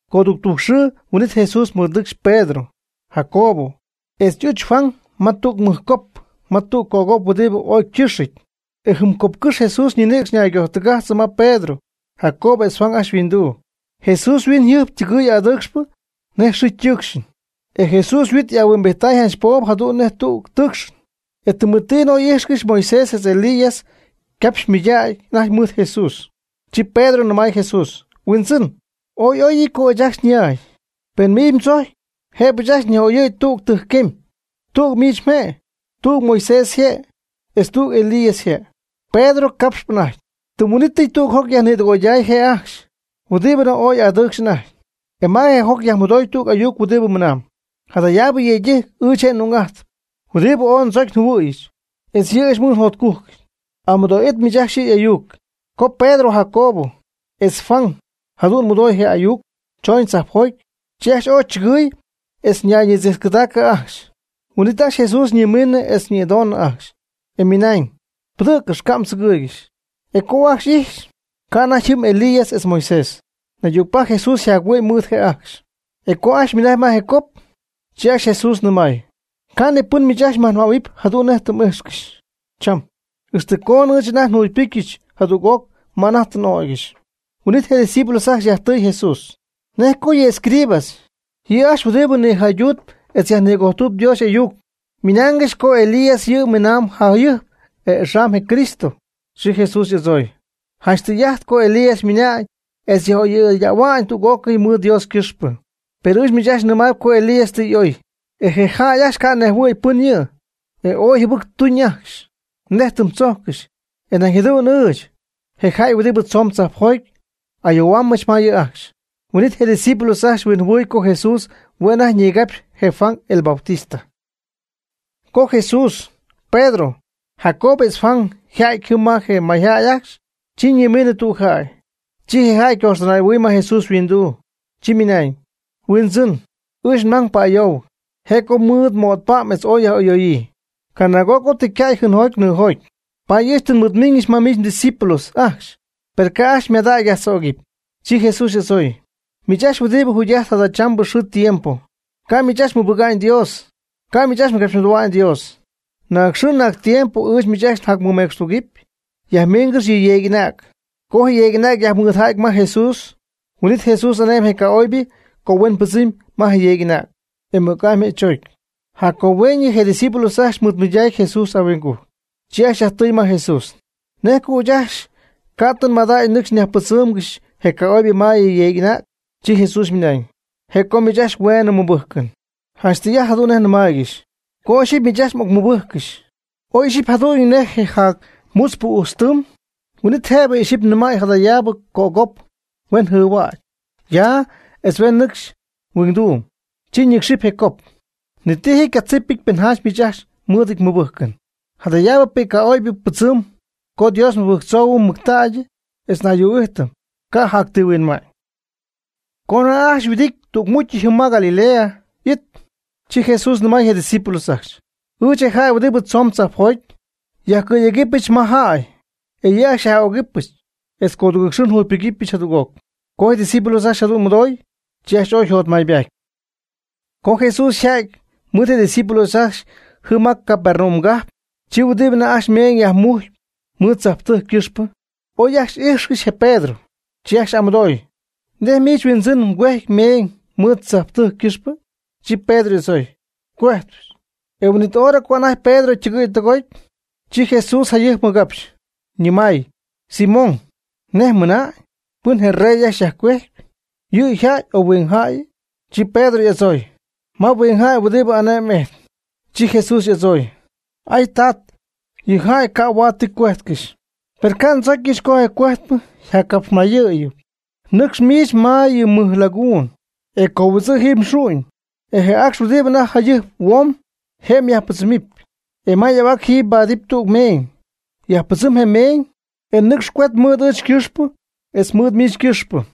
Codudujc xɨɨ huin'it Jesús mɨɨdnɨcxy Pedro, Jacobo, etz y'uch Juan ma tüg mɨjcop, ma tüg cop huɨdibɨ ooy ycɨxɨty. E jɨm copcɨ́xy Jesús ñinïcx ñaygojtɨgajtzɨ ma Pedro, Jacobo etz Juan ajcxy yhuinduu. Jesús yhuiñyjɨjp ytɨgɨɨy adɨɨcxp nej je xɨɨ ytɨɨcxɨn. E Jesús yhuit y'ahuimbijty janch poob jadu'n nej tüg tɨɨcxɨn. E tɨmetiinɨ oy ijxcɨxy Moisés etz Elías ycapxy mɨydägy anajty mɨɨd Jesús. Chi Pedro nɨmay Jesús: ―Huindzɨn, oy y'oyɨty co ɨɨch ajt ya. Pen miich mdzojcpy jëbɨ ɨɨch ajcxy nyaj'oyɨ̈y tugɨɨg tɨjcquemy. Tüg miich mje', tüg Moisés yje', etz tüg Elías yje'. Pedro capxp anajty, tɨm huin'ítɨy tüg joc yajnïdɨgoyday je' ajcxy huɨdibɨ ooy adɨɨcxp anajty. E ma je joc yajmɨdoy tüg ayuc huɨdibɨ ymɨnañ: ―Jadayaabɨ yëydɨjc ɨɨch je' n'ung'ajtpy huɨdibɨ ooy ndzocy njɨhuɨ̈yɨch etz yɨ' ɨɨch mɨɨd njotcujcɨty. Amɨdoo'it miich ajcxy yɨ' y'ayuc. Co Pedro, Jacobo, etz Juan jadu'n mɨdooy je ayuc chooñ jocjoty, chi ajcxy ooy chɨgɨɨy etz ñayñitziitzcɨdaacɨ ajcxy. Huin'it ajcxy Jesús ñimiinɨ etz nïdoñ ajcxy, e ymɨnañ: ―Pɨdɨ̈ccɨx, ca' mdzɨgɨɨygɨxy. E co ajcxy y'ijxɨ̈gy, ca' anajty jɨm Elías etz Moisés. Naydügpajc Jesús yjac-huɨ'my mɨɨd je' ajcxy. E co ajcxy ymɨnajcy ma je cop, chi ajcxy Jesús nɨmay: ―Ca' ni pɨn miich ajcxy nyajnɨmähuɨpy jadu'n nej tɨ m'ijxcɨxy cham, ixtɨ coonɨ ɨɨch anajty tɨ njugypɨcyɨch jadüg'oc ma anajty tɨ n'ögɨch. Huin'it je' ydiscípulos ajcxy yajtɨɨy Jesús: ―¿Nej co yɨ escribas, yɨ' ajcxy huɨdibɨ nïjaydutp etz yajnïguejp Dios y'ayuc, ymɨnaangɨxy co Elías yɨ' miinaam jayɨjp etz axam je Cristo? Chi Jesús y'adzooy: ―Janch tɨy'ajt co Elías ymiina'ñ etz yaj'oyɨydähuamy tüg'ócɨy mɨɨd Dios ycɨxpɨ. Per ɨɨch miich ajcxy nɨmaayb co Elías tɨ y'oy. E je jäy ajcxy ca' nejhuɨ̈y pɨn yɨ', e ooy jɨbɨc tuuñ ajcxy, nej tɨm tzojccɨxy. E nañ jadu'n ɨɨch, je jäy huɨdibɨ tzoon tzajpjoty ayoohuaambɨch ma yɨ' ajcxy. Huin'it je' ydiscípulos ajcxy huinjɨhuɨɨy co Jesús hue' anajty ñigapxyp je Juan, el Bautista. Co Jesús, Pedro, Jacobo etz Juan yjäty jɨm ma je mayjäy ajcxy, chi ñimiinɨ tüg jäy. Chi je jäy ycoxtɨnay'ɨhuɨy ma Jesús yhuinduu, chi ymɨnañ: ―Huindzɨn, ɨɨch nmang pa'ayoohuɨc. Je' co ymɨɨd mo'tpa'm etz oy yaj'ɨyooyii. Canaag'oc tɨ ycäy jɨɨnjoty nɨɨjoty. Paady ɨɨch tɨ nmɨɨdmiiñɨch ma miich mdiscípulos ajcxy, per ca' ajcxy ymadacy yajtzögɨpy. Chi Jesús y'adzooy: ―Miich ajcxy huɨdibɨ jugy'ajtp jadachambɨ xɨɨ tiempo, ca' miich ajcxy mmɨbɨga'ñ Dios, ca' miich ajcxy mgapxymɨdoohua'ñ Dios. ¿Naag xɨɨ naag tiempo ɨɨch miich ajcxy njacmɨmecxtugɨpy? Yajmiingɨx yɨ yeeg'anäg. Co je yeeg'anäg yajmɨɨdja'ty ma Jesús, huin'it Jesús ane'my je ca'oybɨ co huen pɨdzɨm ma je yeeg'anäg. E mɨc'amy je' chögy. Jac co hueeñɨ, je' ydiscípulos ajcxy mɨɨdmɨydac Jesús ahuingujc, chi ajcxy yajtɨɨy ma Jesús: ―¿Nej co ɨɨch ajcxy ca' tɨ nmadägy nɨcx nyajpɨdzɨ́ɨmgɨxyɨch je ca'oybɨ ma je yeeg'anäg? Chi Jesús ymɨnañ: ―Je' co miich ajcxy hueenɨ mmɨbɨjcɨn. Janch tɨy'ajt jadu'n nej nnɨmaaygɨxy, co ixyipy miich ajcxy xy'ocmɨbɨcyɨch, ooy ixyipy jëda'ajty jadu'n nej je jac mutzpɨ ujtz tɨɨm, huin'it jëbɨ ixyipy mnɨmäy jadayaabɨ cop co huen jɨɨhuäcy ya etz huen nɨcxy huingduum, chi ñɨcxɨp je cop. Ni ti ji ycatzipɨty pen janch miich ajcxy mɨɨdɨty mɨbɨjcɨn. Jadayaabɨ pɨcy ca'oybɨ pɨdzɨmɨpy co Dios nmɨbɨjctzoohuɨm mɨctägy etz ayuu'ijt, ca' jac ti huinma'ñ. Co anajty ajcxy yhuɨdity tügmucy jɨm ma Galilea y'it, chi Jesús nɨmay je' ydiscípulos ajcxy: ―Ɨɨch, je jäy huɨdibɨ tzoon tzajpjoty, yajcɨ̈yegɨpyɨch ma jäy. E yɨ' ajcxy xyaj'ögɨbɨch etz codugɨɨg xɨɨ njugypɨgɨpyɨch jadüg'oc. Co je' ydiscípulos ajcxy jadu'n mɨdooy, chi ajcxy ooy yjotmaybaty. Co Jesús yja'ty mɨɨd je' ydiscípulos ajcxy jɨm ma je Capernaum cajp, chi huɨdi anajty ajcxy meeñ yajmujcp mɨɨd tzajptɨjc ycɨxpɨ, oy ajcxy ijxcɨxy je Pedro, chi ajcxy y'amɨdooy: ―¿Nej miich mhuindzɨn ycuejcpy meeñ mɨɨd tzajptɨjc ycɨxpɨ? Chi Pedro y'adzooy: ―Cuejtpy. E huin'it hora co anajty Pedro ytɨgɨ̈y tɨgoty, chi Jesús jayɨjp ymɨgapxy, ñɨmay: ―Simón, ¿nej mmɨna'ñ? ¿Pɨn je rey ajcxy yajcuejcpy? ¿Yɨ' yjäy o huingjäyɨ? Chi Pedro y'adzooy: ―Ma huingjäy huɨdibɨ ane'my ijtp. Chi Jesús y'adzooy: ―Ah, ca'tz yɨ' yjäy huaad ti cuejtcɨxy. Per ca' ndzocyɨch co je cogüejtpɨ nyajcapxmayɨɨyɨm, nɨcx miich ma yɨ mɨj laguun e cohuidzɨ' jiiby mxu'ñ, e je acx huɨdibɨ anajty jayɨjp huoomb, je' myajpɨdzɨmɨpy, e ma y'ahuac jiiby mbaadɨpy tüg meeñ, yajpɨdzɨm je meeñ e nɨcx cuet mɨɨd ɨɨch ycɨxpɨ etz mɨɨd miich ycɨxpɨ.